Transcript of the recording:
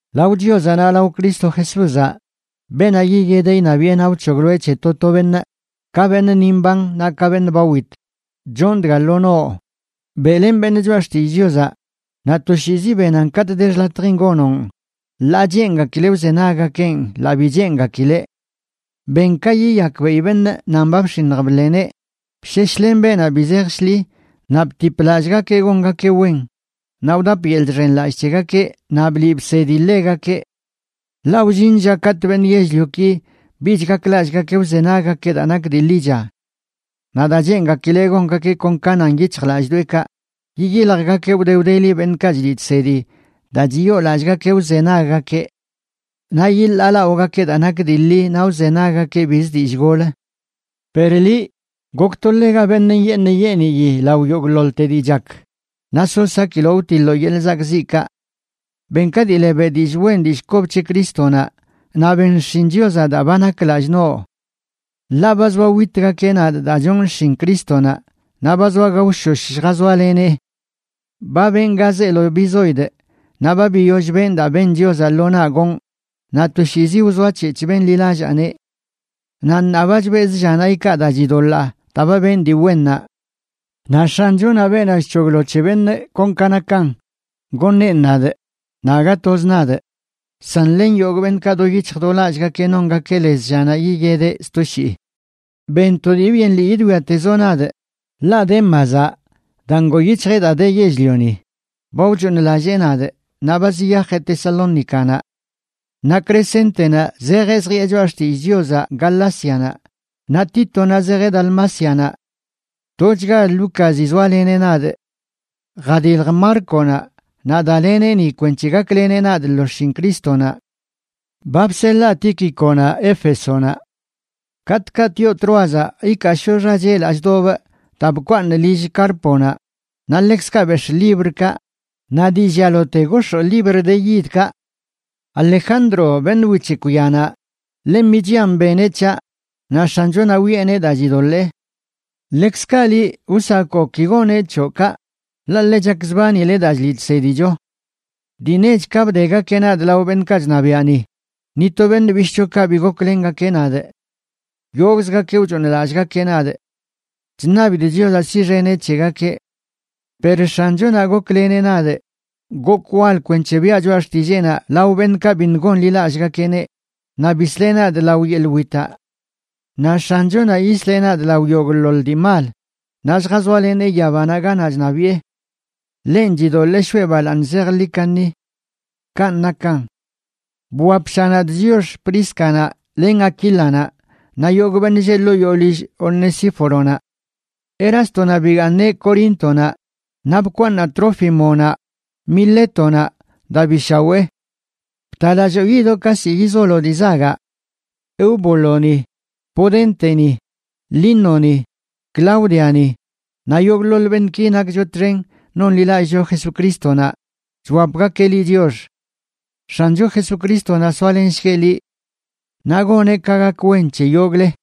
Lao Chiozaꞌ naꞌ lao Cristo Jesúzaꞌ, beenaꞌ yiyedeꞌ iṉabiꞌe naꞌ wc̱hogloeꞌ c̱he to to beṉꞌ, ka beṉꞌ ni mban naꞌ ka beṉꞌ ba wit, chon dga lo noꞌ: Beꞌlen beṉꞌ Choꞌa Xtillꞌ Chiozaꞌ, naꞌ toshiizi benan katꞌ de xḻatjin gonoꞌn, ḻaa cheengakileꞌ wzenaggakeꞌn ḻaa bi cheengakileꞌ. Ben ka yiyakbeꞌi beṉꞌ nan ba bx̱iṉj bḻeneꞌ, bsheshlen beenaꞌ bi zej shḻi, naꞌ btip lallꞌgakeꞌ gongakeꞌ wen, naꞌ wdap yeḻꞌ chxenlallꞌ c̱hegakeꞌ naꞌ bliꞌ bsedi ḻegakeꞌ. Ḻaꞌ wllin lla katꞌ beṉꞌ yell-lioki bich gaklallꞌgakeꞌ wzenaggakeꞌ daa nak dii ḻicha. Naꞌ daa cheengakileꞌ gongakeꞌ kon ka nan yic̱hjlallꞌdoꞌekaꞌ, yiyiljgakeꞌ wde wdeli beṉꞌkaꞌ chliꞌ chsedi daa chiyoolallꞌgakeꞌ wzenaggakeꞌ. Naꞌ yiḻaalaꞌogakeꞌ daa nak dii ḻi naꞌ wzenaggakeꞌ bizə dillꞌ gol. Per liꞌ, gokto ḻega beṉꞌ nyeeṉ nyeeniyi lao yogꞌḻoḻte dii chak, naꞌ so sakiloꞌ wtiḻoo yeḻꞌ zakꞌziꞌkaꞌ. Ben ka dii le beꞌ dillꞌ wen dillꞌ kob c̱he Crístonaꞌ, naꞌ ben xshin Chiozaꞌ daa ba nak lallꞌ noꞌ. Ḻaꞌ ba zoa witgakeꞌ nadꞌ daa chonꞌ xshin Crístonaꞌ, naꞌ ba zoa gaoshosh lljazoalenee. Ba benꞌ ga zeelo bizoidꞌ, naꞌ ba biyoll benꞌ daa ben Chiozaꞌ lo naꞌ gonꞌ, naꞌ toshiizi wzoac̱hec̱hꞌ benḻilallaaneꞌ. Naꞌ ṉaa ba chbezꞌ llanaꞌ ikaa daa chidoḻaa daa ba benꞌ dii wennaꞌ. Naꞌ X̱anchonaꞌ, beenaꞌ chc̱hoglo c̱he beṉꞌ kon ka nakan, goṉeꞌn nadꞌ, naꞌ aga toz nadꞌ, san len yogꞌ beṉꞌkaꞌ do yic̱hj do lallꞌgakeꞌ nongakeꞌ lez llanaꞌ yiyedeꞌ sto shii. Ben to dii byen lii yidwiatezoꞌ nadꞌ, ḻaꞌ Démazaꞌ, daa ngoo yic̱hjeꞌ daa de yell-lioni, ba wchooṉlallee nadꞌ naꞌ ba ziyajeꞌ Tesalónicanaꞌ. Naꞌ Crescéntenaꞌ zejeꞌ zjiꞌe choꞌa xtillꞌ Chiozaꞌ Galácianaꞌ, naꞌ Títonaꞌ zejeꞌ Dalmácianaꞌ. Tochga Lúcazi zoaleneꞌ nadꞌ. Jadilj Márconaꞌ naꞌ daleneꞌ ni kwenc̱he gakleneꞌ nadꞌ lo xshin Crístonaꞌ. Ba bseḻaa Tíquiconaꞌ Éfesonaꞌ. Katꞌkaꞌ tioꞌ Tróazaꞌ ikaashoꞌ xachelaꞌ chdobꞌ daa bkwaaṉꞌ lill Cárponaꞌ; naꞌ ḻekzkaꞌ bex̱ꞌ librkaꞌ, naꞌ dii llialote gox̱oo libr de yidkaꞌ. Alejandro, beṉꞌ wic̱hekw yanaꞌ, ḻe michian beneꞌ c̱haꞌ, naꞌ X̱anchonaꞌ wiꞌeneꞌ daa chidoḻee. Ḻekzkaꞌ liꞌ, wsakoꞌ ki goneꞌ c̱hoꞌ kaꞌ, ḻaꞌ ḻe chakzbanileꞌ daa chliꞌ chsedicho. Dii nech ka bdegakeꞌ nadꞌ lao beṉꞌkaꞌ chṉabiaꞌ ni, ni to beṉꞌ bishꞌchokaꞌ bi goklengakeꞌ nadꞌ; yogꞌzgakeꞌ wchooṉlallꞌgakeꞌ nadꞌ. Chṉabidꞌ Chiozaꞌ siꞌxeneꞌ c̱hegakeꞌ. Per X̱anchonaꞌ gokleneꞌ nadꞌ gokꞌ wal kwenc̱he biaꞌ choꞌa xtilleenaꞌ lao beṉꞌkaꞌ biṉꞌ gonḻilallꞌgakeꞌneꞌ, naꞌ bisleꞌ nadꞌ lao yeḻꞌ witaꞌ. Naꞌ X̱anchonaꞌ yisleꞌ nadꞌ lao yogꞌḻoḻ dii mal, naꞌ lljazoalenee yabanaꞌ ganaꞌ chṉabiꞌe. Ḻenꞌ chidoḻee shoꞌe balaaṉ zejḻi kaṉi. Kanꞌ nakan. Bwapsha nadꞌ chiox Príscanaꞌ len Aquílanaꞌ, naꞌ yogꞌ beṉꞌ lleꞌ ḻoo yoo lill Onesíforonaꞌ. Erástonaꞌ bigaaṉeꞌ Coríntonaꞌ, naꞌ bkwaaṉaꞌ Trófimonaꞌ Milétonaꞌ daa bi shawee. Btalalloo yidoꞌ ka ziꞌ yizoloꞌ dii zagaꞌ. Eubúloni, Pudénteni, Línoni, Cláudiani, naꞌ yogꞌḻoḻ beṉꞌki nakcho txen nonḻilallꞌcho Jesucrístonaꞌ, chwapgakeꞌ liꞌ chiox. X̱ancho Jesucrístonaꞌ soalenshgueꞌ liꞌ. Naꞌ goneꞌ ka gak wen c̱he yogꞌle.